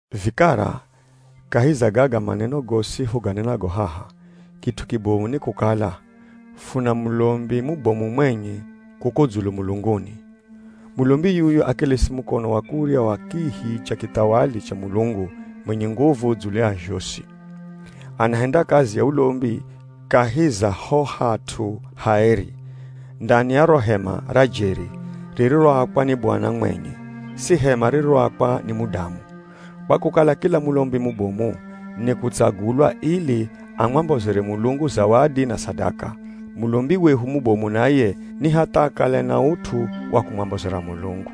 Vikara, kahi za gaga maneno gosi fuganenago haha, kit'u kibomu ni kukala, funa mulombi mubomu mwenye kuko dzulu mulunguni. Mulombi yuyu akelesi mukono wa kurya wa kihi cha kithawali cha Mulungu mwenye nguvu dzulu ya zhosi. Anahenda kazi ya ulombi kahi za ho hat'u haeri, ndani ya ro hema ra jeri ririroakwa ni Bwana mwenye, si hema ririroakwa ni mudamu. Kwa kukala kila mulombi mubomu nikutsagulwa ili amwambozere Mulungu zawadi na sadaka, mulombi wehu mubomu naye ni hatha akale na ut'u wa kumwambozera Mulungu.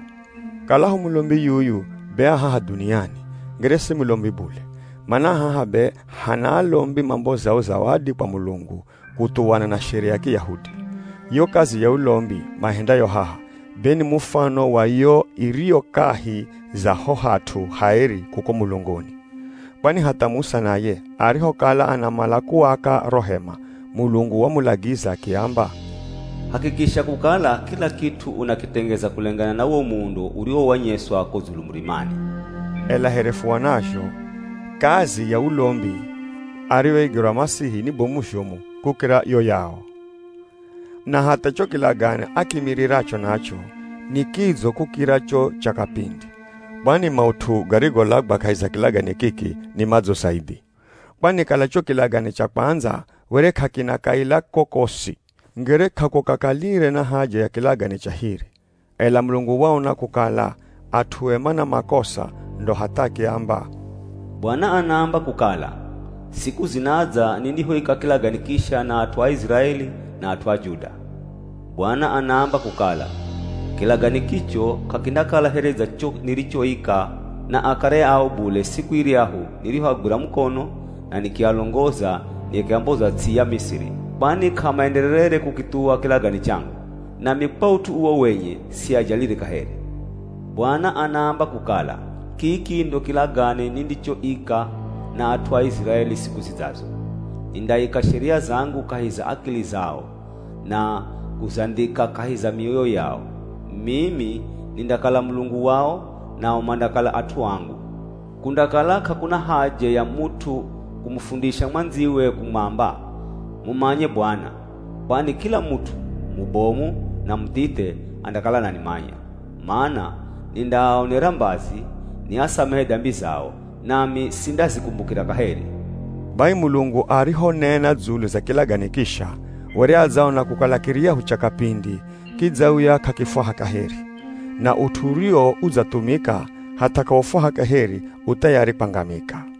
Kalaho mulombi yuyu be a haha dhuniani, ngere si mulombi bule, mana haha be hana alombi mambozao zawadi kwa Mulungu kuthuwana na Sheria ya Kiyahudi. Yo kazi ya ulombi maihendayo haha, be ni mufano wa yo iriyo kahi za ho hat'u haeri kuko mulunguni. Kwani hatha Musa naye arihokala anamala kuaka ro hema, Mulungu wamulagiza akiamba, “Hakikisha kukala kila kit'u unakitengeza kulengana na wo muundo uriwowanyeswa ko dzulu murimani.” Ela here fuonazho, kazi ya ulombi ariyoigerwa Masihi ni bomu zhomu kukira yo yao. Na hatha cho kilagane akiimiriracho nacho, ni kidzo kukira cho cha kapindi. Kwani maut'u garigolagwa kahi za kilagane kiki ni madzo zaidhi. Kwani kala cho kilagane cha kwandza were k'akina kaila kokosi, ngere k'akukakalire na haja ya kilagane cha hiri. Ela Mulungu waona kukala at'ue mana makosa ndo hatha akiamba, “Bwana anaamba kukala, siku zinadza nindihoika kilagane kisha na at'u a Iziraeli na at'u Juda. Bwana anaamba kukala, kilagane kicho k'akindakala here dza cho nirichochika na akare ao bule siku iryahu nirihoagwira mukono na nikialongoza nikiamboza ts'i ya Misiri. Kwani k'amaendererere kukithuwa kilagane changu nami kwa ut'u uwo wenye siajalire kaheri. Bwana anaamba kukala, kiki ndo kilagane nindichoika na at'u a Iziraeli siku zidzazo, nindaika sheria zangu kahi za akili zao, na kuzandhika kahi za mioyo yao. Mimi nindakala Mulungu wao, nao mandakala at'u angu. Kundakala k'akuna haja ya mut'u kumufundisha mwandziwe kumwamba, ‘Mumanye Bwana.’ Kwani kila mut'u, mubomu na muthithe andakala ananimanya. Mana nindaaonera mbazi, niasamehe dambi zao, nami sindazikumbukira kaheri.” Bai Mulungu arihonena dzulu za kilagane kisha, were adzaona kukala kiryahu cha kapindi kidzauya k'akifwaha kaheri. Na ut'u uriwo udzathumika hatha k'aufwaha kaheri u thayari kwangamika.